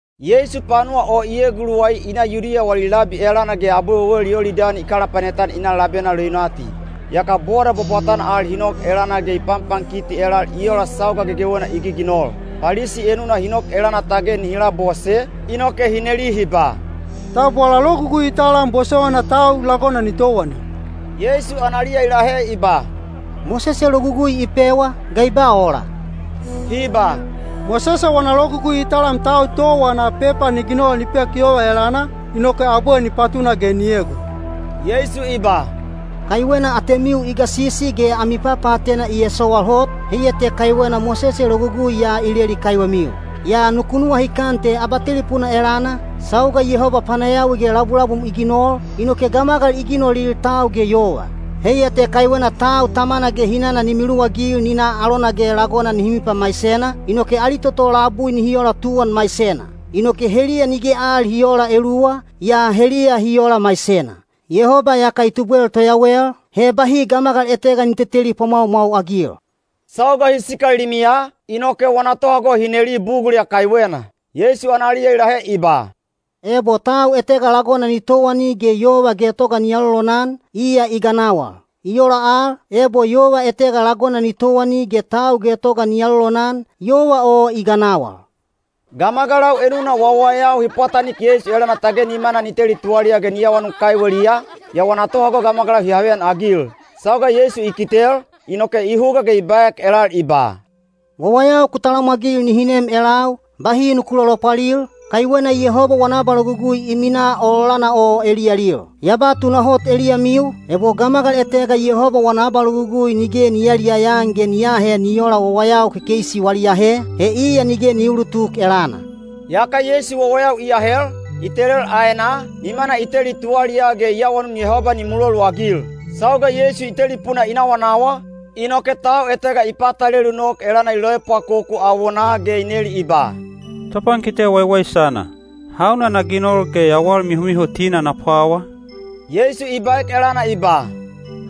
Yeisu panuwa o i eguluwai i na Yudiya wali labi elana ge abwe wewel Yolidani i kalapanet-an i na labena leunati. Yaka boda bwabwatana al hi nok elana ge i panpankiti elal i ola sauga gegewena i giginol. Palisi enuna hi nok elana tage nihi labose, inoke hi neli hi ba, “Tab wala logugui i talam bosowaina tau lagona ni towani?” Yeisu analiya i lahe i ba, “Mosese logugui i pewa, ga i ba ola?” Hi ba, “Mosese wana logugui i talam tau towa ana pepa ni ginol ni pek yova elana, inoke abwe ni patuna ge ni egon.” Yeisu i ba, “Kaiwena atemiu i gasisi ge ami papaatena i esowal hot, heiya te kaiwena Mosese logugui ya i leli kaiwemiu. Yaa nuku nuwahikan te abatelipuna elana, sauga Yehoba panayawi ge labulabum i ginol, inoke ‘gamagal i ginolil tau ge yova.’ ‘Heiya te kaiwena tau tamana ge hinana ni miluwagil ni na alona ge lagona nihi mipamaisena, inoke ali toto labui nihi ola tuwan maisena.’ Inoke heliya nige al hi oola eluwa, yaa heliya hi ola maisena. Yehoba iyaka i tubwel toyawel, he bahi gamagal etega ni teteli pwamwaumwau-agil.” Sauga hi sikal limiya, inoke wana tohago hi neli bugul ya kaiwena. Yeisu analiya i lahe i ba, “Ebo tau etega lagona ni towani ge yova getoga ni alolonan, iya i ganawal. I ola al, ebo yova etega lagona ni towani ge tau getoga ni alolonan, yova o i ganawal.” Gamagalau enuna wawayau hi pwatanik Yeisu elana tage nimana ni teli tuwaliyaa ge ni awanun kaiweliya, yaa wana tohago gamagalau hi haveyanagil. Sauga Yeisu i kitel, inoke i huga ge i baek elal i ba, “Wawayau ku talamwagil nihi nem elau, bahi nuku lolopwalil, kaiwena Yehoba wana abalogugui i minaa ololana o eliyalil. Ya ba tunahot eliyamiu, ebo gamagal etega Yehoba wana abalogugui nige ni yayaliyaya-an ge ni aahe ni oola wawayau kekeisi wali ahe, he iya nige ni uulutuk elana.” Yaka Yeisu wawayau i ahel, i telel aenaa, nimana i teli tuwaliyaa ge i awanun Yehoba ni muloluagil. Sauga Yeisu i telipuna i nawanawa, inoke tau etega i patalelu nok elana i loepwakoku awonaa ge i neli i ba, “Topankite waiwaisana, hauna na ginol ge yawal mihomihotina na pwawa?” Yeisu i baek elana i ba,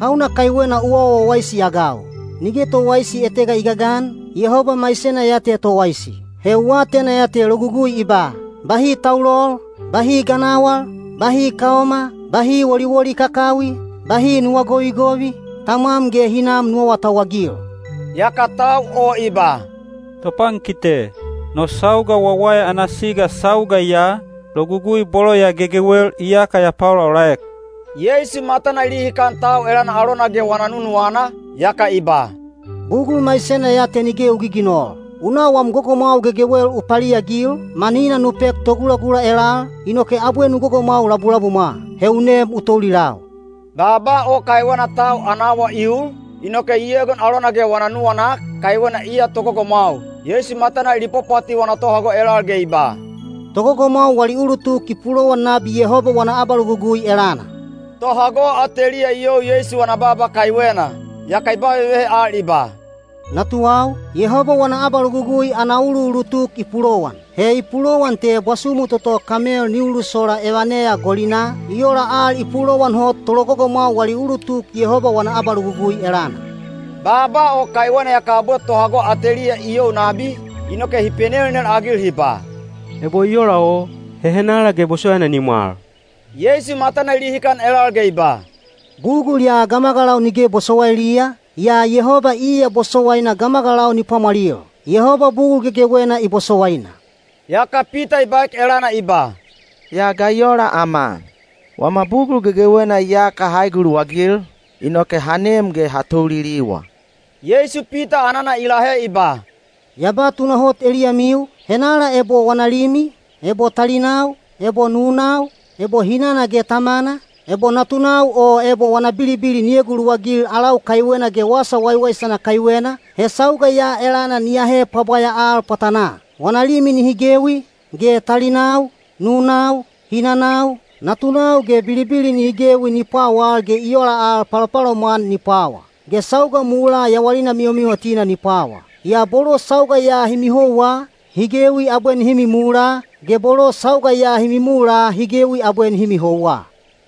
“Hauna kaiwena u awa wawaisi-agau? Nige towaisi etega i gagan, Yehoba maisena ya te towaisi. He u atena ya te logugui i ba, ‘Bahi taulol, bahi ganawal, bahi kaoma, bahi woliwoli kakawi, bahi nuwa govigovi, tamwam ge hinam nu awatauwagil.’” Yaka tau o i ba, “Topankite, no sauga wawaya ana siga sauga ya, logugui bolo ya gegewel iyaka ya paolaolaek.” Yeisu matana i lihikan tau elana alona ge wana nunuwana, yaka i ba, “Bugul maisena ya te nige u giginol. U na wam gogomwau gegewel u paliagil, manina nu pek togulagula elal, inoke abwe nu gogomwau labulabumwa. He u nem u toulilau.” Baaba o kaiwena tau ana awa i ul, inoke i egon alona ge wana nuwanak, kaiwena iya togogomwau. Yeisu matana i lipwapwati wana tohago elal ge i ba, “Togogomwau wali ulutuk i pulowan nabi Yehoba wana abalogugui elana!” Tohago ateliya i you Yeisu wana baaba kaiwena. Yaka i ba vevehe al i ba, “Natuwau, Yehoba wana abalogugui ana uluulutuk i pulowan! He i pulowan te bwasumu toto kamel ni ulusola evaneya golinaa, i ola al i pulowan hot tologogomwau wali ulutuk Yehoba wana abalogugui elana.” Baaba o kaiwena yaka abwe tohago ateliya i you nabi, inoke hi penelnel-agil hi ba, “Ebo i ola o, he henala ge bosowaina ni mwal?” Yeisu matana i lihikan elal ge i ba, “Bugul ya gamagalau nige bosowailiya, yaa Yehoba iya bosowaina gamagalau ni pwamwalil. Yehoba bugul gegewena i bosowaina.” Yaka Pita i baek elana i ba, “Yaa ga i ola ama? Wama bugul gegewena iyaka ha eguluwagil, inoke ha nem ge ha touliliwa.” Yeisu Pita anana i lahe i ba, “Ya ba tunahot eliyamiu, henala ebo wana limi, ebo talinau, ebo nunau, ebo hinana ge tamana, ebo natunau o ebo wana bilibili ni eguluwagil alau kaiwena ge wasa waiwaisana kaiwena, he sauga ya elana ni ahe pwabwaya al pwatanaa. Wana limi nihi gewi, ge talinau, nunau, hinanau, natunau ge bilibili nihi gewi ni pwawal-ge i ola al palopalomwan ni pwawa. Ge sauga mulaa yawalina mihomihotina ni pwawa. Yaa bolo sauga ya hi mihouwa, hi gewi abwe nihi mimula, ge bolo sauga ya hi mimula hi gewi abwe nihi mihouwa.”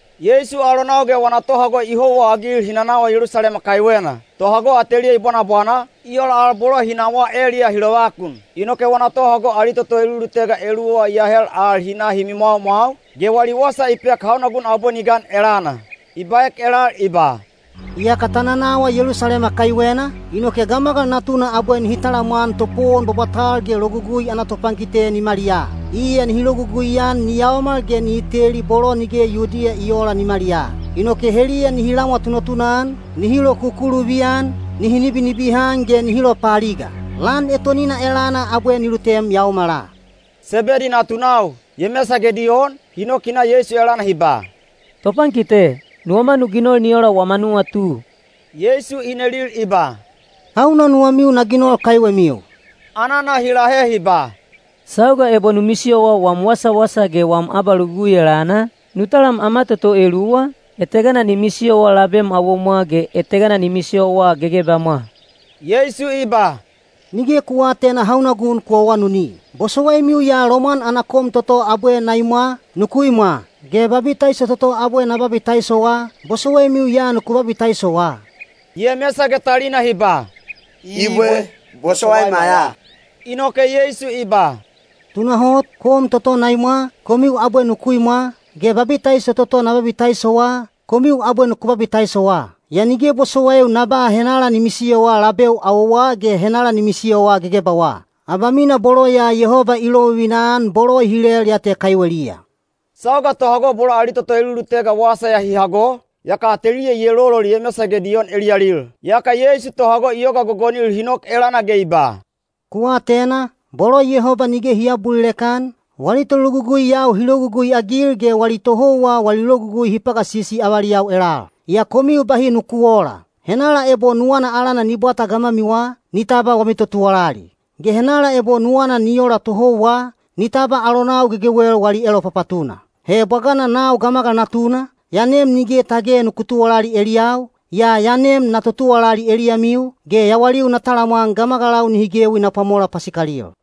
Yeisu alonau ge wana tohago i houwaagil hi nanawa Yelusalema kaiwena. Tohago ateliya i bwanabwana, i ola al bolo hi nawaa eliyaa hi lovakun. Inoke wana tohago ali toto elulutega eluwa i ahel al hi na hi mimwaumwau, ge wali wasa i pek hauna gun abwe ni gan elana. I baek elal i ba, “Iyaka ta nanawa Yelusalema kaiwena, inoke Gamagal Natuna abwe nihi talamwan topowon bwabwatal ge Logugui ana topankite nimaliyaa. Iya nihi logugui-an ni yaomal ge nihi teli bolo nige Yudiya i oola nimaliyaa. Inoke heliya nihi lamwa tunatuna-an, nihi lokukuluvi-an, nihi nibinibihan ge nihi lopaaliga. Lan etonina elana abwe ni lutem yaomala.” Sebedi natunau, Yemesa ge Diyon, hi nok hi na Yeisu elana hi ba, “Topankite, nuwama nu ginol ni ola wama nuwatu.” Yeisu i nelil i ba, “Hauna nuwamiu na ginol kaiwemiu?” Anana hi lahe hi ba, “Sauga ebo nu misiyowa wam wasawasa ge wam abalogugui elana, nu talam ama toto eluwa, etegana ni misiyowa labem awomwa ge etegana ni misiyowa gegebamwa.” Yeisu i ba, “Nige ku aatena hauna gun ku awanuni. Bosowaimiu ya lomwan ana kom toto abwe na imwa, nuku imwa? Ge babitaiso toto abwe na babitaisowa, bosowaimiu ya nuku babitaisowa?” Yemesa ge talina hi ba, “Ibwe. Bosowaima ya.” Inoke Yeisu i ba, “Tunahot, kom toto na imwa, komiu abwe nuku imwa, ge babitaiso toto na babitaisowa, komiu abwe nuku babitaisowa. Yaa nige bosowaiu na ba henala ni misiyowa labeu awowa ge henala ni misiyowa gegebawa. Abamina bolo ya Yehoba i lovivina-an bolo i hilel ya te kaiweliya.” Sauga tohago bolo ali toto elulutega wasa ya hi hago, yaka ateliya i elolol Yemesa ge Diyon eliyalil. Yaka Yeisu tohago i yoga gogonil hi nok elana ge i ba, “Ku atena, bolo Yehoba nige hi aabulilek-an, wali tologuguiyau hi logugui-agil ge wali tohouwa wali logugui hi pagasisi avaliyau elal. Yaa komiu bahi nuku oola. Henala ebo nuwana alana ni bwata gamwamiwa, ni tabwa wami totuwalali. Ge henala ebo nuwana ni ola tohouwa, ni tabwa alonau gegewel wali elopapatuna. He bwagana nau Gamagal Natuna, ya nem nige tage nuku tuwalali eliyau, yaa ya nem na totuwalali eliyamiu, ge yawaliu na talamwan gamagalau nihi gewi na pwamola pasikalil.”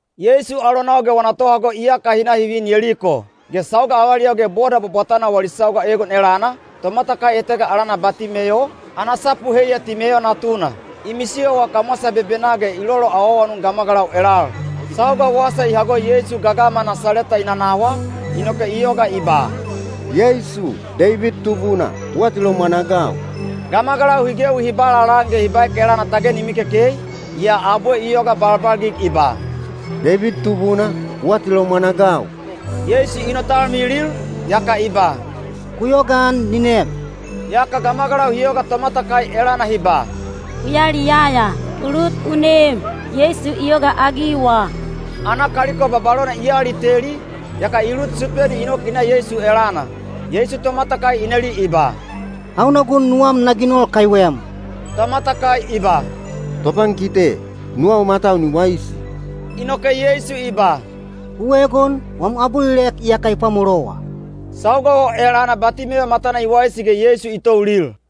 Yeisu alonau ge wana tohago iyaka hi na hi vin Yeliko. Ge sauga avaliyau ge boda bwabwatana wali sauga egon elana, tomatakai etega alana Batimeyo, (ana sapu heiya Timeyo natuna), i misiyowa kamwasa bebenaa ge i loloawaawanun gamagalau elal. Sauga wasa i hago Yeisu gagama Nasaleta i nanawa, inoke i yoga i ba, “Yeisu, Deibid Tubuna, u atilomwan-agau!” Gamagalau hi gewi hi ba lalaan ge hi baek elana tage ni mikekei, yaa abwe i yoga balbalgig i ba, “Deibid Tubuna, u atilomwan-agau!” Yeisu i notalmilil, yaka i ba, “Ku yogaan ni nem.” Yaka gamagalau hi yoga tomatakai elana hi ba, “U yaliyaya! U lut u nem! Yeisu i yogaagiwa!” Ana kaliko babalona i aliteli, yaka i lut supeni i nok i na Yeisu elana. Yeisu tomatakai i neli i ba, “Hauna gun nuwam na ginol kaiwem?” Tomatakai i ba, “Topankite, nuwau matau ni waisi.” Inoke Yeisu i ba, “U egon, wam abulilek iyaka i pwamolowa.” Sauga o elana Batimeyo matana i waisi ge Yeisu i toulil.